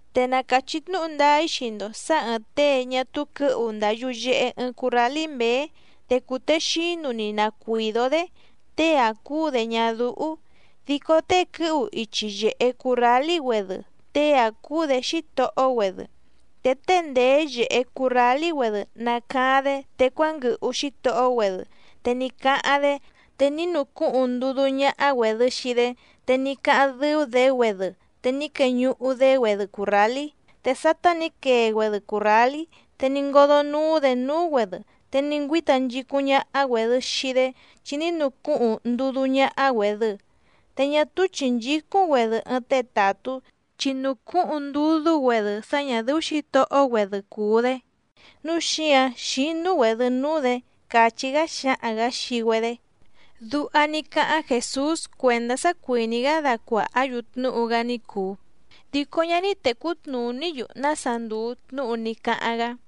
’Te na càchí tnúhu ndáá‑í xii‑ndo sǎ ɨ̀ɨⁿ tée ñá túú quɨ̌hu ndàa yuyehe ɨɨⁿ currálí mběé, te cùtexínu‑ni na cuìdó‑dé, tée‑áⁿ cúú‑dě ñádúhú. Dico tée quɨ́hu ichi yèhe currálí‑güedɨ, tée‑áⁿ cúú‑dě xítohó‑güedɨ. Te tée ndèé yèhe currálí‑güedɨ nàcaáⁿ‑dé te cuánguɨhu xítohó‑güedɨ te ní cáháⁿ‑dé, te ní nucúhuⁿ ndudú ñáhá‑güèdɨ xii‑dé. Te ní cáháⁿ dɨ́ú‑dě‑güedɨ te ní queñuhu‑dé‑güedɨ cùrrálí. Te sátá nǐ quee‑güedɨ cùrrálí, te ní ngódó núú‑dě núú‑güedɨ, te ní ngüíta nchicúⁿ ñáhá‑güèdɨ xii‑dé chi ní nucúhuⁿ ndudú ñáhá‑güèdɨ. Te ñá túú chìnchícúⁿ‑güedɨ ɨɨⁿ tée tàtú, chi nùcúhuⁿ ndudú‑güedɨ sá ñà dɨ́ú xǐtohó‑güedɨ cùu‑dé, núu xíǎⁿ xínú‑güèdɨ núú‑dě —càchí‑gá xáhaⁿ‑gǎ xii‑güedé. Duha ní cáháⁿ Jèsús cuèndá sá cuìní‑gá dacuàhá‑yu tnúhu‑gá ní cùu, dico ñá ní tècú tnùní‑yu nása ndùu tnúhu ní cáháⁿ‑gá.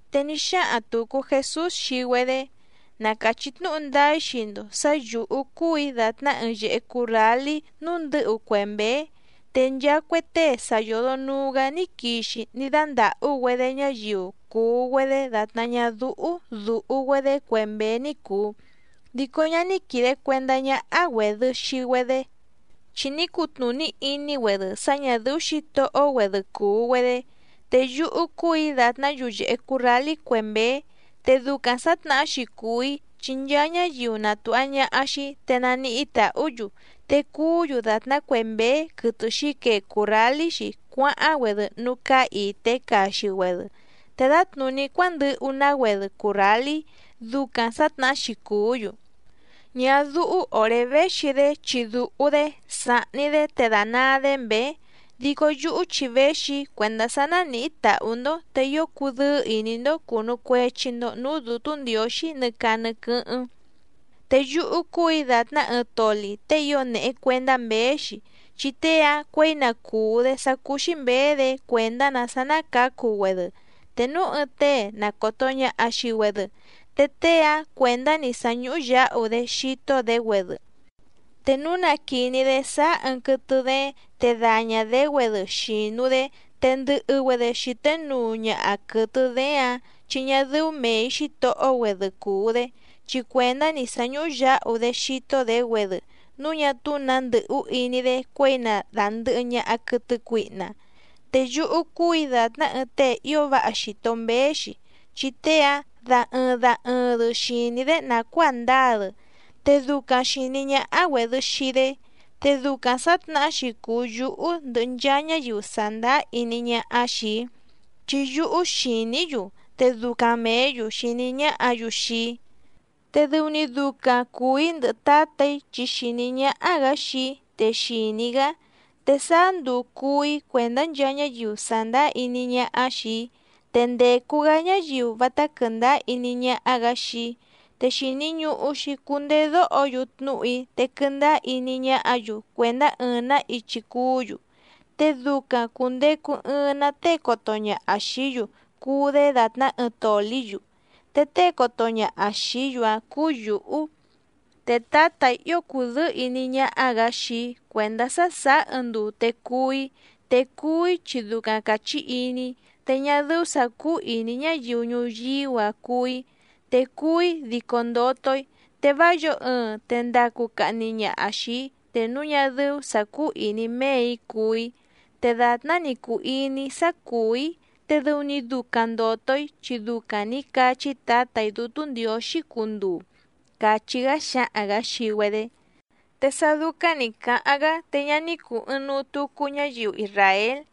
Te ní xáhaⁿ tùcu Jesús xii‑güedé: —Na càchí tnúhu ndáá‑í xii‑ndo sǎ yǔhú cúù‑í dàtná ɨɨⁿ yèhe currálí núú ndɨ̌hu cue mběé. Te nchaa cue tée sa yòdo nuu‑gá ní quixi ní dándàhú‑güedé ñáyiu cùu‑güedé dàtná ñádúhú dùhu‑güedé cue mběé ní cùu, dico ñá ní quìde cuendá ñáhá‑güèdɨ xii‑güedé, chi ní cutnùní iní‑güedɨ sá ñà dɨ́ú xǐtohó‑güedɨ cùu‑güedé. Te yúhú cúù‑í dàtná yuyèhe currálí cue mběé. Te ducaⁿ sǎtnahá‑xi cùu‑í chi nchaa ñáyiu na tùha ñaha xii‑í te naníhí tàhú‑yu. Te cùú‑yu dàtná cue mběé quɨtɨ xǐquee cùrrálí‑xi cuáháⁿ‑güedɨ núú cáá ìté caxi‑güedɨ, te dǎtnùní cuándɨhu‑ná‑güedɨ cùrrálí, ducaⁿ sǎtnahá‑xi cùú‑yu. ’Ñádúhú òré véxi‑dé chi dùhu‑dé, sàhni‑dé te dànaa‑dé mběé, dico yúhú chi véxi‑í cuèndá sá nánìhí tàhú‑ndó te ío cudɨ́ɨ́ ìní‑ndó cùnu cuechi‑ndo núú Dǔtú Ndiǒxí nɨ caa nɨ quɨ́hɨ́ⁿ. Te yúhú cúù‑í dàtná ɨɨⁿ toli tée ío nèhe cuendá mběé‑xi, chi tée‑áⁿ cuěi na cùú‑dé sá cúú‑xí mběé‑dě cuèndá‑nǎ sá ná cǎcu‑güedɨ. Te núu ɨɨⁿ tée na còto ñaha xii‑güedɨ, te tée‑áⁿ cuèndá‑ni sá ñúhú yǎhu‑dé xító‑dě‑güedɨ. Te núu na quìní‑dé sáá ɨɨⁿ quɨtɨ dééⁿ te dàña‑dé‑güedɨ xìnu‑dé, te ndɨ̀hɨ‑güedɨ xité nuu ñaha quɨ̀tɨ dééⁿ‑ǎⁿ, chi ñá dɨ́ú mèi xítohó‑güedɨ cùu‑dé. Chi cuèndá‑ni sá ñúhú yǎhu‑dé xító‑dě‑güedɨ núu ñá túú nǎ ndɨ̀hú iní‑dé cuěi na dàndɨhɨ ñaha quɨtɨ cuihna. Te yúhú cúù‑í dàtná ɨɨⁿ tée ío váha xìto mbéé‑xi, chi tée‑áⁿ da ɨɨⁿ da ɨɨⁿ‑dɨ xìní‑í‑dé nàcuáa ndǎa‑dɨ, te ducaⁿ xìní ñáhá‑güèdɨ xii‑dé. Te ducaⁿ sǎtnahá‑xi cùu yúhú ndɨhɨ nchaa ñáyiu sàndáá iní ñáhá xìi‑í, chi yúhú xìní‑í‑yu te ducaⁿ mèé‑yu xìní ñáhǎ‑yu xii‑í. ’Te dɨu‑ni ducaⁿ cùu‑í ndɨhɨ Tǎtà‑í, chi xìní ñáhá‑gǎ xii‑í te xìní‑í‑gá. Te sáá nduu cùú‑í cuèndá nchaa ñáyiu sàndáá iní ñáhá xìi‑í. Te ndècu‑gá ñáyiu vátá quɨ̀ndáá iní ñáhá‑gǎ xii‑í. Te xìni ñuhu‑xi cundedóho‑yu tnúhu‑í te quɨndáá iní ñáhǎ‑yu cuèndá ɨɨⁿ‑nǎ ichi cuú‑yu, te ducaⁿ cùndecu ɨɨⁿ‑ná tée coto ñaha xìí‑yu cuu‑dé dàtná ɨɨⁿ tòlí‑yu, te tée coto ñaha xìí‑yu‑áⁿ cúú yǔhú. ’Te Tǎtà‑í ío cùdɨ́ɨ́ ìní ñáhá‑gǎ xii‑í cuèndá sá sàá ɨɨⁿ nduu te cuú‑í, te cuú‑í chi ducaⁿ càchí iní‑í, te ñá dɨ́ú sǎ cúú ìní ñáyiu ñuyíú‑a cuú‑í, te cuú‑í dico ndoto‑í. Te vá yǒo ɨɨⁿ te ndacu cahni ñaha xìi‑í, te núu ñá dɨ́ú sǎ cúú ìní méè‑í cuú‑í. Te dàtná‑ni cùu iní‑í sá cùú‑í te dɨu‑ni ducaⁿ ndòto‑í chi ducaⁿ nǐ cachí Tǎtà‑í Dútú Ndiǒxí cunduu —càchí‑gá xáhaⁿ‑gǎ xii‑güedé. Te sá dúcáⁿ nǐ cáháⁿ‑gá te ñá ní cùu ɨɨⁿnuu tucu ñáyiu isràél.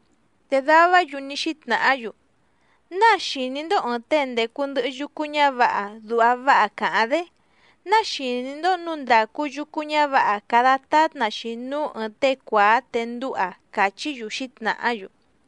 Te davá‑yu ní xítnàhá‑yu: —¿Náa xìní‑ndó ɨ̀ɨⁿ tée ndècu ndɨhɨ yucu ñávǎha duha váha càháⁿ‑dé? ¿Náa xìní‑ndó nǔu ndàcu yucu ñávǎha cada tátna‑xi núú ɨ̀ɨⁿ tée cuàá te ndúha? —càchí‑yu xǐtnàhá‑yu.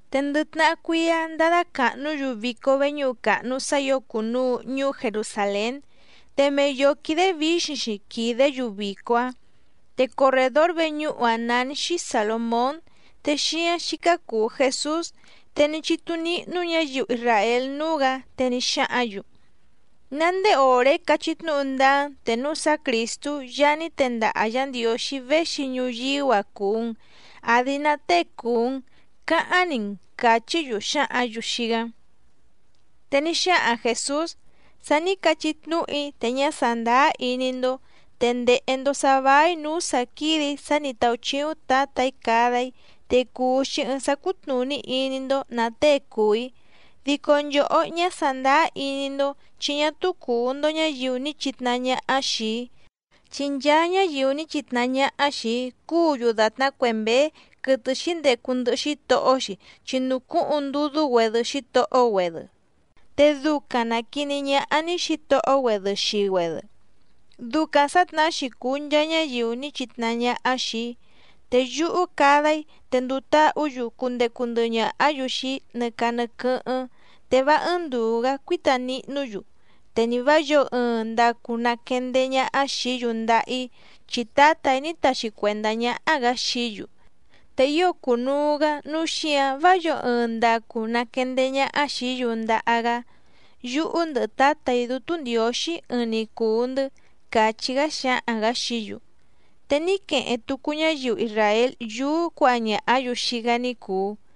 Te ndɨ tnahá cuíá ndádá càhnú‑yu vico veñúhu càhnu sá ǐo cùnuu ñuú Jerusàlén, te mei yǒó quídé vǐxiⁿ‑xi quìdé‑yu vico‑áⁿ. Te corrèdór veñúhu‑áⁿ nání‑xí Sàlomón, te xíáⁿ xícá cùu Jesús. Te ní chítú níhnú ñǎyiu isràél núú‑gǎ, te ní xáhǎⁿ‑yu: —¿Ná ndéé òré cachí tnúhu ndáá‑n, te núu sá Crìstú Yaá ní tendaha Yǎ Ndiǒxí véxi ñuyíú‑a cùu‑n, àdi ná tée cùu‑n?, cáháⁿ‑ni‑n —càchí‑yu xǎhǎⁿ‑yu xii‑gá. Te ní xáhaⁿ Jèsús: —Sa ní cachí tnúhu‑í te ñá sàndáá iní‑ndó, te ndèhe‑ndo sá váí nǔú sǎ quídè‑í sá nǐ táúchíúⁿ Tǎtà‑í cada‑í, te cùu‑xi ɨɨⁿ sá cútnùní iní‑ndó nǎ tée cùu‑í. Dico nchòhó ñá sàndáá iní‑ndó, chi ñá túú cùu‑ndo ñáyiu ní chitnahá ñáhá xìi‑í. Chi nchaa ñáyiu ní chitnahá ñáhá xìi‑í cùú‑yu dàtná cue mběé quɨtɨ xǐndecu ndɨhɨ xítohó‑xi chi nùcúhuⁿ ndudú‑güedɨ xítohó‑güedɨ, te ducaⁿ nàquiní ñáhá‑ní xǐtohó‑güedɨ xii‑güedɨ. Ducaⁿ sǎtnahá‑xi cùu nchaa ñáyiu ní chitnahá ñáhá xìi‑í. Te yúhú cada‑í te nduu táhǔ‑yu cundecu ndɨhɨ ñàhá‑yu xii‑í nɨ caa nɨ quɨ́hɨ́ⁿ te vá ɨ́ɨ́ⁿ ndùu‑gá cuíta nihnú‑yu, te ni vǎ yǒo ɨɨⁿ ndacu naquendeé ñáhá xìí‑yu ndaha‑í. Chi Tǎtà‑í ní taxi cuèndá ñáhá‑gǎ xií‑yu. Te ío cùnuu‑gá nǔu xíǎⁿ vá yǒo ɨɨⁿ ndacu naquendeé ñáhá xìí‑yu ndaha‑gá. Yúhú ndɨhɨ Tǎtà‑í Dútú Ndiǒxí ɨɨⁿ‑ni cùu‑ndɨ́ —càchí‑gá xáhaⁿ‑gǎ xií‑yu. Te ní queheⁿ tucu ñáyiu isràél yúú cuǎha ñàhá‑yu xii‑gá ní cùu.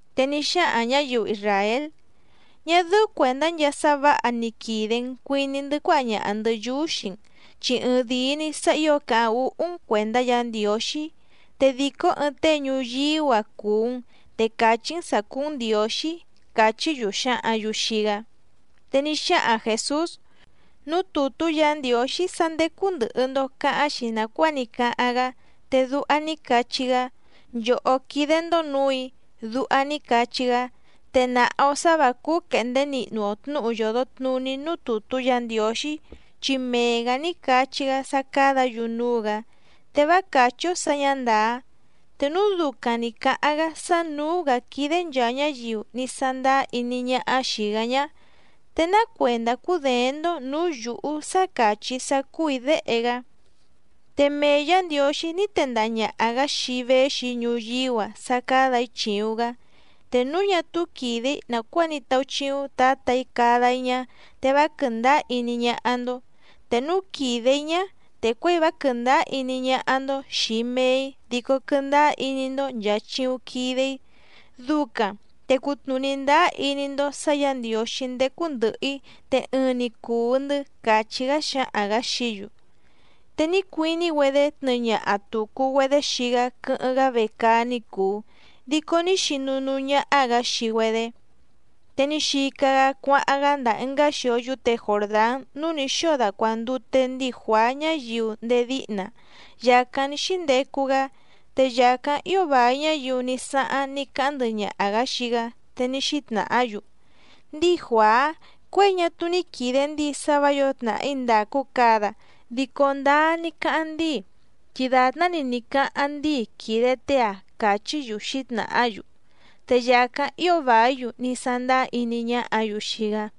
Te ní xáhaⁿ ñǎyiu isràél: —Ñá dɨ́ú cuèndá nchaa sá vǎha ni quìde‑n cuiní‑ndɨ́ cuáha ñaha‑ndɨ̌ yúú xii‑n, chi ɨɨⁿ dìi‑ni sá ǐo càháⁿ úhú‑n cuèndá Yǎ Ndiǒxí. Te dìcó ɨɨⁿ tée ñuyíú‑a cùu‑n te càchí‑n sǎ cúú‑n Ndiǒxí —càchí‑yu xǎhǎⁿ‑yu xii‑gá. Te ní xáhaⁿ Jèsús: —Núú tùtú Yǎ Ndiǒxí sá ndécú ndɨ̀hɨ‑ndo cáháⁿ‑xi nàcuáa ní cáháⁿ‑gá, te duha ní cachí‑gá: “Nchòhó quídé‑ndó nǔù‑í”, duha ní cachí‑gá. Te nàha‑o sá vǎ cúú quèhndé nihnu‑o tnǔhu yòdo tnuní núú tùtú Yǎ Ndiǒxí, chi mee‑gǎ ní cachí‑gá sá cádǎ‑yu núú‑gǎ, te vá càchí‑ó sǎ ñǎ ndàá. Te núu ducaⁿ nǐ cáháⁿ‑gá sá nǔú‑gǎ quídé nchàa ñáyiu ní sándáá iní ñáhá xìi‑gá ñá, ¿te ná cuèndá cúděéⁿ‑ndó nǔú yǔhú sá càchí‑í sá cúù‑í Déhe‑gá? Te mee Yǎ Ndiǒxí ní tendaha ñàha‑gá xii‑í véxi‑í ñuyíú‑a sá cádà‑í chìuⁿ‑gá. Te núu ñá túú quìde‑í nàcuáa ní táúchíúⁿ Tǎtà‑í cada‑í ñá, te vá quɨ̀ndáá iní ñáhá‑ndó. Te núu quìde‑í ñá, te cuěi vá quɨ̀ndáá iní ñáhá‑ndó xìi mee‑í dico quɨndáá iní‑ndó nchàa chiuⁿ quide‑í. Ducaⁿ te cutnùní ndáá iní‑ndó sǎ Yǎ Ndiǒxí ndécú ndɨ̀hɨ‑í te ɨɨⁿ‑ni cùu‑ndɨ́ —càchí‑gá xáhaⁿ‑gǎ xií‑yu. Te ní cuiní‑güedé tnɨɨ ñaha tùcu‑güedé xii‑gá quɨ́hɨ́ⁿ‑gá vecaá ní cùu, dico ní xinu núú ñáhá‑gǎ xii‑güedé. Te ní xica‑gá cuáháⁿ‑gá ndàa ɨngá xio yúte Jòrdán núú nǐ xóo dacuàndute ndíi Juàá ñáyiu ndéé díhna, yàcáⁿ ní xíndecu‑gá. Te yàcáⁿ ío vài ñáyiu ní sáháⁿ ní cáháⁿ ndɨhɨ ñaha xìi‑gá, te ní xítnàhá‑yu: —Ndíi Juàá, cuěi ñá túú ní quìde ndíi sá vǎ yǒo tnàhí ndàcu cada dico ndáá ní cáháⁿ ndíi, chi dàtná‑ni ní cáháⁿ ndíi quìde tée‑a —càchí‑yu xǐtnàhá‑yu. Te yàcáⁿ ío vàí‑yu ní sándáá iní ñáhǎ‑yu xii‑gá.